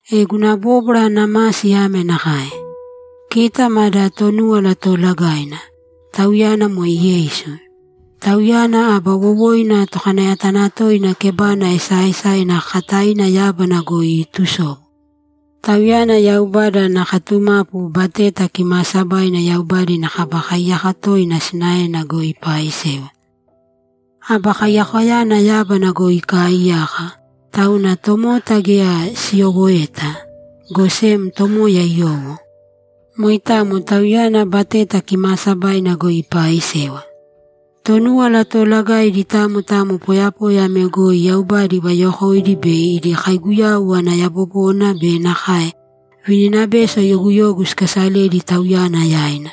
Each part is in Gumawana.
E guna bóbwara ana masi ame nakae: Kita mada Tonúwala Toolagaina; Tauyana moe Yeisu. Tauyana aba wowoina Tokanayatanatoina kebana esaaesaina kakataina yábana goi iitusobu. Tauyana Yaubada ana katumapu Bateta Kimaasabaina Yaubada ina Kaba Kaiyaka toina sinaena goi ipaaisewa. Aba Kaiyakoyana yábana goi ikaaiyaka, tauna tomota geya siyowoeta, go sem Tomoya iyowo. Moitamo Tauyana Bateta Kimaasabaina goi ipaaisewa. Tonúwala Toolagaidi tamo tamo poyapoya ame goi Yaubada ivayokoidi bei idi kauyagu ana yabobona be nakae vininabeso yoguyogu sikasaledi Tauyana yaina.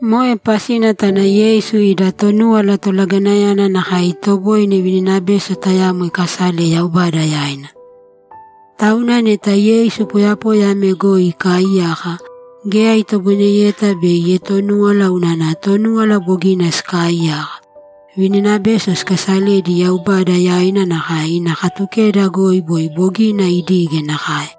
Moe pasina tauna Yeisu ida Tonúwala Tolagainayana nakae itoboine vininabeso tayamo ikasale Yaubada yaina. Tauna neta Yeisu poyapoya ame goi ikaaiyaka, geya itoboineyeta bei ietonúwala unana Tonúwala bogina sikaaiyaka, vininabeso sikaasaledi Yaubada yaina nakae ina Katukeda goi boi bogina idige nakae.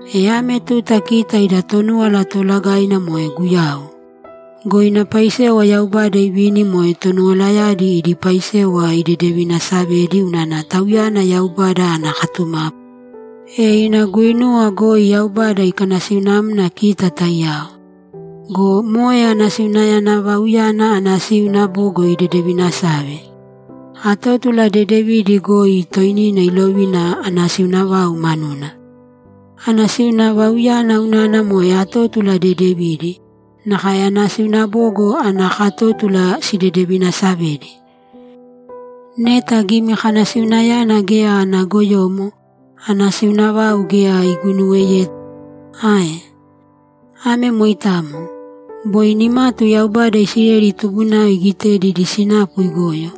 E ame tuta kita ida Tonúwala Toolagaina moe Guyau. Go ina paisewa Yaubada ivini moe tonuwalayadi idi paisewa idedevinasavedi unana Tauyana Yaubada ana katumapu, e ina guinuwa goi Yaubada ikanasiunamna kita taiyao. Go moe anasiuna vauyana anasiuna bogo idedevinasave. Atótula dedevidi goi toinina ilovina anasiuna vau manuna. Anasiuna vauyana unana moe atótula dedevidi, nakae anasiuna bogo ana katótula sidedevinasavedi. Neta gimikanasiunayana geya ana goyomo, anasiuna vau geya iguinuweyeta ae? Ame moitamo. Boi nimatu Yaubada Isileli tubunao igitedi idi sinapu igoyo,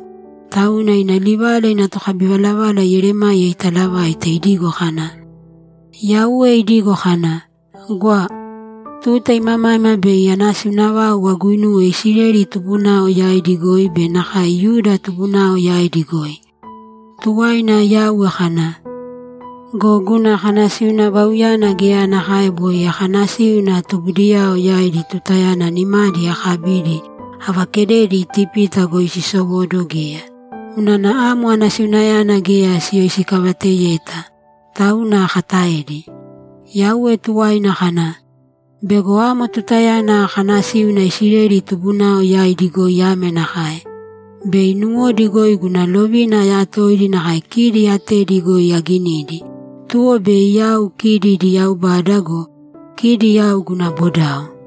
tauna ina livala ina tokabivalavala Yeremaya italavaite idigo kana, ‘Yauwe idigo kana, “Gwa! Tuta imamaima bei anasiuna vau aguinuwe Isileli tubunao yaidi goi be nakae Yuda tubunao yaidi goi.” Tuwaina Yauwe kana, “Go guna kanasiuna vauyana geya nakae boi akanasíuna tubudiyao yaidi tutayana nimadi akabidi avakededi Itipita goi sisowóduwo geya; unana amo anasiunayana geya siyoisikavateyeta, tauna akataedi.” Yauwe tuwaina kana, “Bego amo tutayana akanasíuna Isileli tubunao yaidi goi ame nakae: Bei nuwodi goi guna lovina ayatoidi nakae kidi atedi goi aginidi, tuwo bei yau kidi idi Yaubada go, kidi yau guna bodao.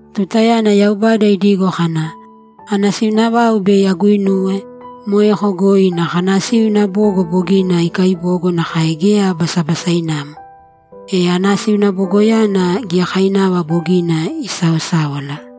Tutayana Yaubada idigo kana, ‘Anasiuna vau bei aguinuwe’, moeko goi ina kanasiuna bogo bogina ikaibogo nakae geya basabasainamo. E anasiuna bogoyana giyakainava bogina isaosáwala.